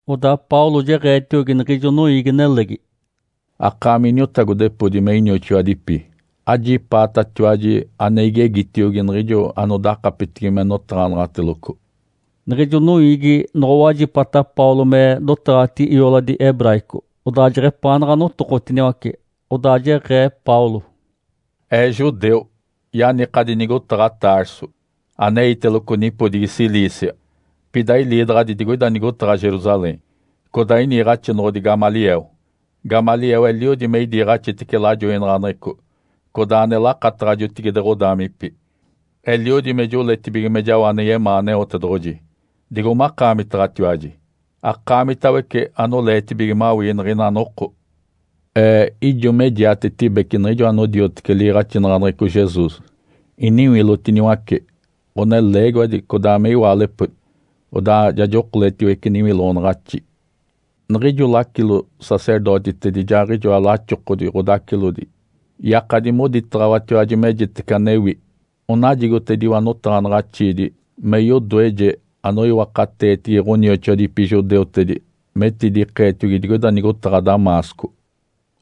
Odaa Paulo jeɡ̶eetiogi niɡ̶ijo noiigi-nelegi, “Akaami iniotagodepodi me inioxoadipi, ajipaatatiwaji ane igegitiogi niɡ̶ijo anodakapetigi me notaɡ̶anaɡ̶ateloco.” Niɡ̶ijo noiigi noɡ̶owajipata Paulo me dotaɡ̶atigi ioladi hebraico, odaa jeɡ̶epaanaɡ̶a notokotiniwace. Odaa jeɡ̶ee Paulo, “Ee judeu. Yanikadi nigotaɡ̶a Tarso aneiteloco nipodigi Cilícia. Pida iliidaɡ̶adi digoina nigotaɡ̶a Jerusalém, codaa iniiɡ̶axinoɡ̶odi Gamaliel. Gamaliel eliodi me idiiɡ̶axitece lajoinaɡ̶aneɡ̶eco codaa ane lakataɡ̶a jotigide ɡ̶odaamipi. Eliodi me joletibige me jao ane yemaa Aneotedoɡ̶oji, digo makaamitaɡ̶atiwaji, akaamitawece anoleetibige mawii niɡ̶ina noko. Ee ijo me jiatetibece niɡ̶ijo anodiotece liiɡ̶axinaɡ̶aneɡ̶eco Jesus. Iniwilotiniwace ɡ̶oneleegiwadi codaa me iwaalepodi, odaa ja jokoletiwece niwiloɡ̶onaɡ̶axi. Niɡ̶ijo lacilo-sacerdotitedi ijaaɡ̶ijoa laxokodi ɡ̶odacilodi yakadi moditaɡ̶awatiwaji mejitece anewi. Onajigotediwa notaɡ̶anaɡ̶axiidi me yodoeje anoiwakateetigi ɡ̶onioxoadipi judeutedi metidikeetiogi digoida nigotaɡ̶a Damasco.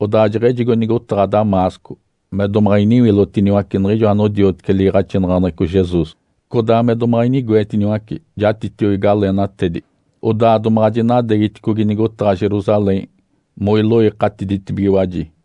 Odaa jeɡ̶ejigo nigotaɡ̶a Damasco me domaɡ̶a iniwilotiniwace niɡ̶ijo anodiotece liiɡ̶axinaɡ̶aneɡ̶eco Jesus codaa me domaɡ̶a inigoetiniwace jatitiogi galeenatedi, odaa domaɡ̶a jinadeegiticogi nigotaɡ̶a Jerusalém moiloikatiditibigiwaji.”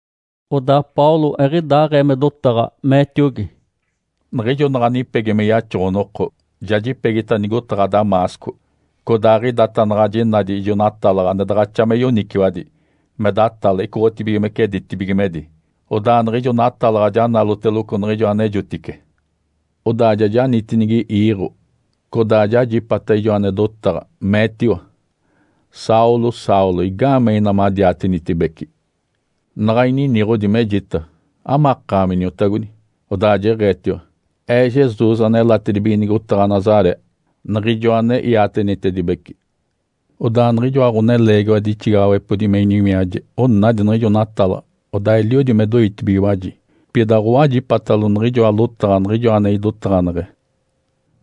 Odaa Paulo eɡ̶idaaɡ̶ee me dotaɡ̶a, meetiogi, “Niɡ̶ijo naɡ̶a nipegi me yaxoɡ̶o-noko, ja jipegita nigotaɡ̶a Damasco. Codaaɡ̶idata naɡ̶a jinadi ijo natalaɡ̶a ane daɡ̶axa me yoniciwadi me datale icoɡ̶otibigimece ditibigimedi. Odaa niɡ̶ijo natalaɡ̶a ja naloteloco niɡ̶ijo anejotice. Odaa ja janitinigi iiɡ̶o, codaa jajipata ijo ane dotaɡ̶a, meetiwa, ‘Saulo, Saulo, igaamee ina madiatenitibece?’ Naɡ̶a ininiɡ̶odi, mejita, ‘Amakaami, Iniotagodi?’ Odaa jeɡ̶eetiwa, ‘Ee Jesus, anelatibige nigotaɡ̶a Nazaré, Niɡ̶ijoa ane iatenitedibece.’ Odaa niɡ̶ijoa ɡ̶oneleegiwadi ixigaɡ̶awepodi me iniwiaje onadi niɡ̶ijo natalaɡ̶a, odaa eliodi me doitibigiwaji, pida aɡ̶owajipatalo niɡ̶ijoa lotaɡ̶a Niɡ̶ijoa ane idotaɡ̶aneɡ̶e.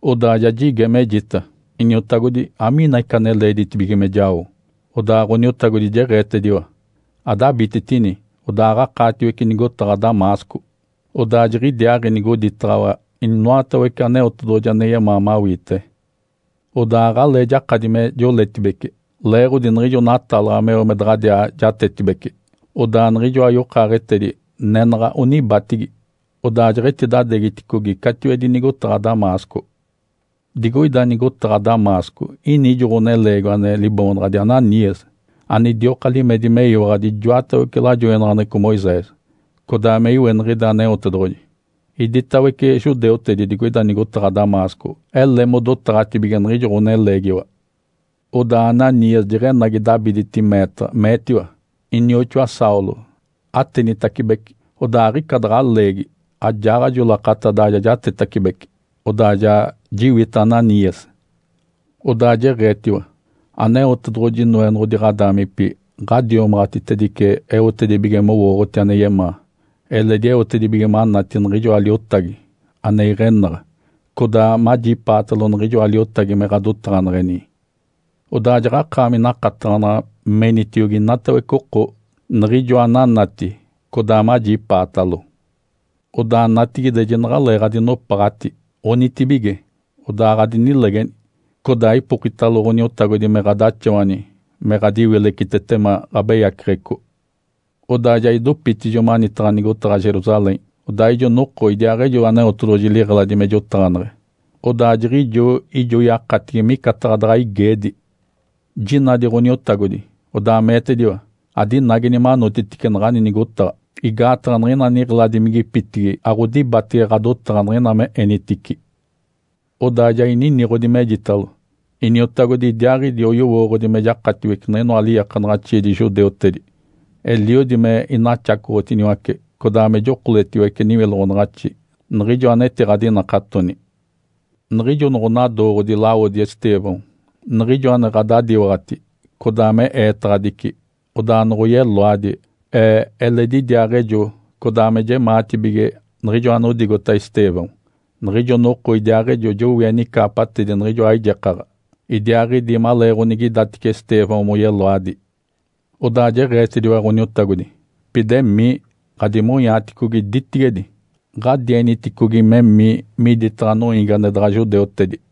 Odaa ja jige, mejita, ‘Iniotagodi, amiini ica ane leeditibige me jao?’ Odaa Ǥoniotagodi jeɡ̶eetediwa, ‘Adabititini, odaaɡ̶akaatiwece nigotaɡ̶a Damasco. Odaa jiɡ̶idiaaɡ̶i nigoditaɡ̶awa inoatawece Aneotedoɡ̶oji ane yemaa mawiite.’ Odaa aɡ̶alee jakadi me joletibece leeɡ̶odi niɡ̶ijo natalaɡ̶a meo me daɡ̶adiaa jatetibece. Odaa niɡ̶ijoa yokaaɡ̶etedi nenaɡ̶a onibatigi, odaa jeɡ̶etidadeegiticogi catiwedi nigotaɡ̶a Damasco. Digoida nigotaɡ̶a Damasco ini ijo ɡ̶oneleegiwa ane liboonaɡ̶adi Ananias, anidioka limedi meyiwaɡ̶adi ijoatawece lajoinaɡ̶aneɡ̶eco Moisés, codaa me iweniɡ̶ide Aneotedoɡ̶oji. Iditawece judeutedi digoida nigotaɡ̶a Damasco ele modotaɡ̶atibige niɡ̶ijo ɡ̶oneleegiwa. Odaa Ananias jeɡ̶enagi dabiditi meetaɡ̶a, meetiwa, ‘Inioxoa Saulo, atenitacibece!’ Odaa aɡ̶ica daɡ̶a leegi ajaaɡ̶ajo lakata, ja jatetacibece, odaa ja jiwita Ananias. Odaa jeɡ̶eetiwa, ‘Aneotedoɡ̶oji, Noenoɡ̶odi ɡ̶odaamipi ɡ̶adiomaɡ̶atitedice eotedibige mowooɡ̶oti ane yemaa, eledi eotedibige manati niɡ̶ijoa Liotagi ane iɡ̶enaɡ̶a, codaa majipaatalo niɡ̶ijoa Liotagi me ɡ̶adotaɡ̶aneɡ̶eni. Odaa jaɡ̶akaami nakataɡ̶anaɡ̶a menitiogi inatawece oko niɡ̶ijoa ananati codaa majipaatalo. Odaa natigide, jinaɡ̶aleeɡ̶adinopaɡ̶ati. Onitibige, odaa adinilegeni! Codaa ipokitalo Ǥoniotagodi me ɡ̶adaxawani me ɡ̶adiwilecitetema ɡ̶abeyaceɡ̶eco.’ Odaa ja idopitijo manitaɡ̶a nigotaɡ̶a Jerusalém. Odaa ijo noko idiaaɡ̶ejo Aneotedoɡ̶oji liɡ̶eladi me jotaɡ̶aneɡ̶e, odaa jiɡ̶ijo ijo yakatigi me micataɡ̶a daɡ̶a igeedi. Jinadi Ǥoniotagodi, odaa meetediwa, ‘Adinageni manotitice naɡ̶ani nigotaɡ̶a, igaataɡ̶a niɡ̶ina niɡ̶eladimigipitigi aɡ̶odibatege ɡ̶adotaɡ̶a niɡ̶ina me enitici.’ Odaa ja ininiɡ̶odi, mejitalo, ‘Iniotagodi, idiaaɡ̶idi oyowooɡ̶odi me jakatiwece niɡ̶inoa liiakanaɡ̶axiidi judeutedi, eliodi me inaxacoɡ̶otiniwace codaa me jokoletiwece niwiloɡ̶onaɡ̶axi niɡ̶ijo anetiɡ̶adinakatoni. Niɡ̶ijo noɡ̶onadooɡ̶odi lawodi Estêvão, niɡ̶ijo ane ɡ̶adadiwaɡ̶ati codaa me eetaɡ̶adici, odaa noɡ̶oyeloadi, ee eledi idiaaɡ̶ejo codaa me jemaatibige niɡ̶ijo anodigota Estêvão. Niɡ̶ijo noko idiaaɡ̶ejo jowie nicaapatedi niɡ̶ijoa aijekaɡ̶a idiaaɡ̶idi maleeɡ̶onigidatice Estêvão moyeloadi.’ Odaa jeɡ̶eetediwa Ǥoniotagodi, ‘Pida emii, ɡ̶adimonyaaticogi ditigedi. Ǥadieniticogi memii miditaɡ̶a noiigi ane daɡ̶a judeutedi.’”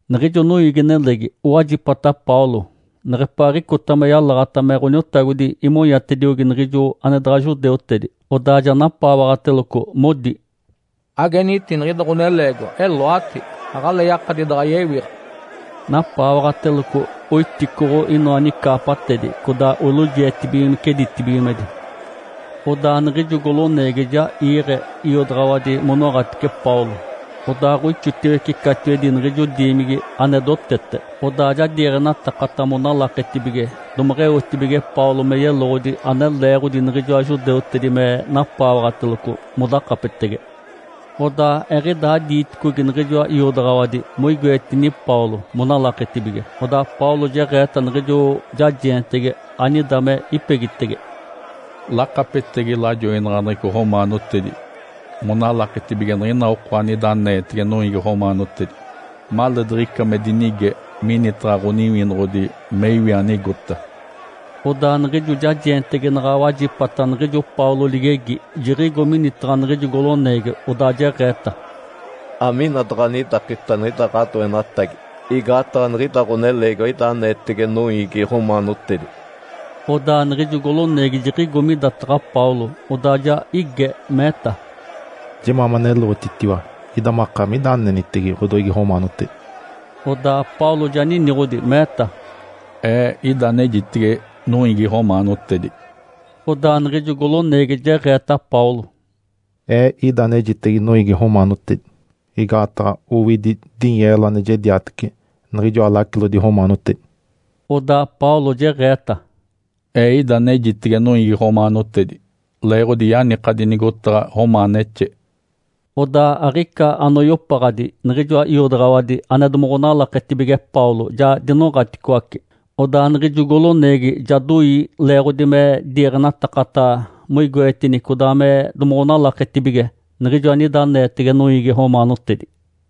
Niɡ̶ijo noiigi-nelegi owajipata Paulo neɡ̶epaaɡ̶icota me yalaɡ̶ata me Ǥoniotagodi imonyatediogi niɡ̶ijo ane daɡ̶a judeutedi. Odaa ja napaawaɡ̶ateloco, modi, “Ageniti niɡ̶ida ɡ̶oneleegiwa! Eloati! Aɡ̶alee yakadi daɡ̶a yewiɡ̶a!” Napaawaɡ̶ateloco oiticoɡ̶o inoa nicaapatedi, codaa olojietibigimece ditibigimedi. Odaa niɡ̶ijo goloneegi ja iiɡ̶e iodaɡ̶awadi monoɡ̶atice Paulo, odaaɡ̶oixotiwece catiwedi niɡ̶ijo diimigi ane dotete, odaa ja diiɡ̶enatakata monalaketibige domeɡ̶eotibige Paulo me yeloɡ̶odi ane leeɡ̶odi niɡ̶ijoa judeutedi me napaawaɡ̶ateloco modakapetege. Odaa eɡ̶idaa diiticogi niɡ̶ijoa iodaɡ̶awadi moigoetini Paulo monalaketibige, odaa Paulo jeɡ̶eeta niɡ̶ijo jajeentegi anida me ipegitege, “Lakapetegi lajoinaɡ̶aneɡ̶eco romaanotedi monalaketibige niɡ̶ina oko anida aneetege noiigi romaanotedi, maleediɡ̶ica me dinige minitaɡ̶a ɡ̶oniwinoɡ̶odi me iwi anigota.” Odaa niɡ̶ijo jajeentegi naɡ̶a wajipata niɡ̶ijo Paulo ligegi, jiɡ̶igo minitaɡ̶a niɡ̶ijo goloneegi, odaa jeɡ̶eeta, “Amina daɡ̶anidakita niɡ̶ida ɡ̶adoenatagi, igaataɡ̶a niɡ̶ida ɡ̶oneleegiwa ida aneetege noiigi romaanotedi.” Odaa niɡ̶ijo goloneegi jiɡ̶igo midataɡ̶a Paulo, odaa ja ige, meeta, “Jemaa maneloɡ̶otitiwa! Ida makaami ida anenitege ɡ̶odoiigi romaanotedi?” Odaa Paulo ja niniɡ̶odi, meeta, “Ee ida anejitege noiigi romaanotedi.” Odaa niɡ̶ijo goloneegi jeɡ̶eeta Paulo, “Ee ida anejitege noiigi romaanotedi igaataɡ̶a owidi dinyeelo ane jediatece niɡ̶ijoa lacilodi romaanotedi.” Odaa Paulo jeɡ̶eeta, “Ee ida anejitege noiigi romaanotedi leeɡ̶odi yanikadi nigotaɡ̶a romaanexe.” Odaa aɡ̶ica anoyopaɡ̶adi niɡ̶ijoa iodaɡ̶awadi ane domoɡ̶onalaketibige Paulo ja dinoɡ̶aticoace. Odaa niɡ̶ijo goloneegi ja doi leeɡ̶odi me diiɡ̶enatakata moigoetini codaa me domoɡ̶onalaketibige niɡ̶ijo anida aneetege noiigi romaanotedi.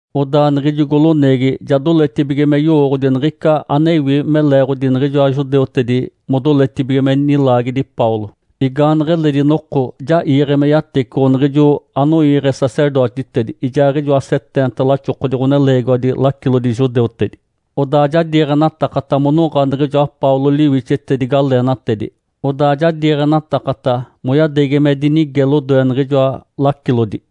Odaa niɡ̶ijo goloneegi ja doletibige me yowooɡ̶odi niɡ̶ica anewi me leeɡ̶odi niɡ̶ijoa judeutedi modoletibige me nilaagedi Paulo. Igaaneɡ̶eledi noko ja iiɡ̶e me yatecoɡ̶o niɡ̶ijo anoiiɡ̶e sacerdotitedi ijaaɡ̶ijoa seteenta laxokodi ɡ̶oneleegiwadi lacilodi judeutedi. Odaa ja diiɡ̶enatakata monoɡ̶a niɡ̶ijoa Paulo liwixetedi galeenatedi, odaa ja diiɡ̶enatakata moyadeegi me dinige lodoe niɡ̶ijoa lacilodi.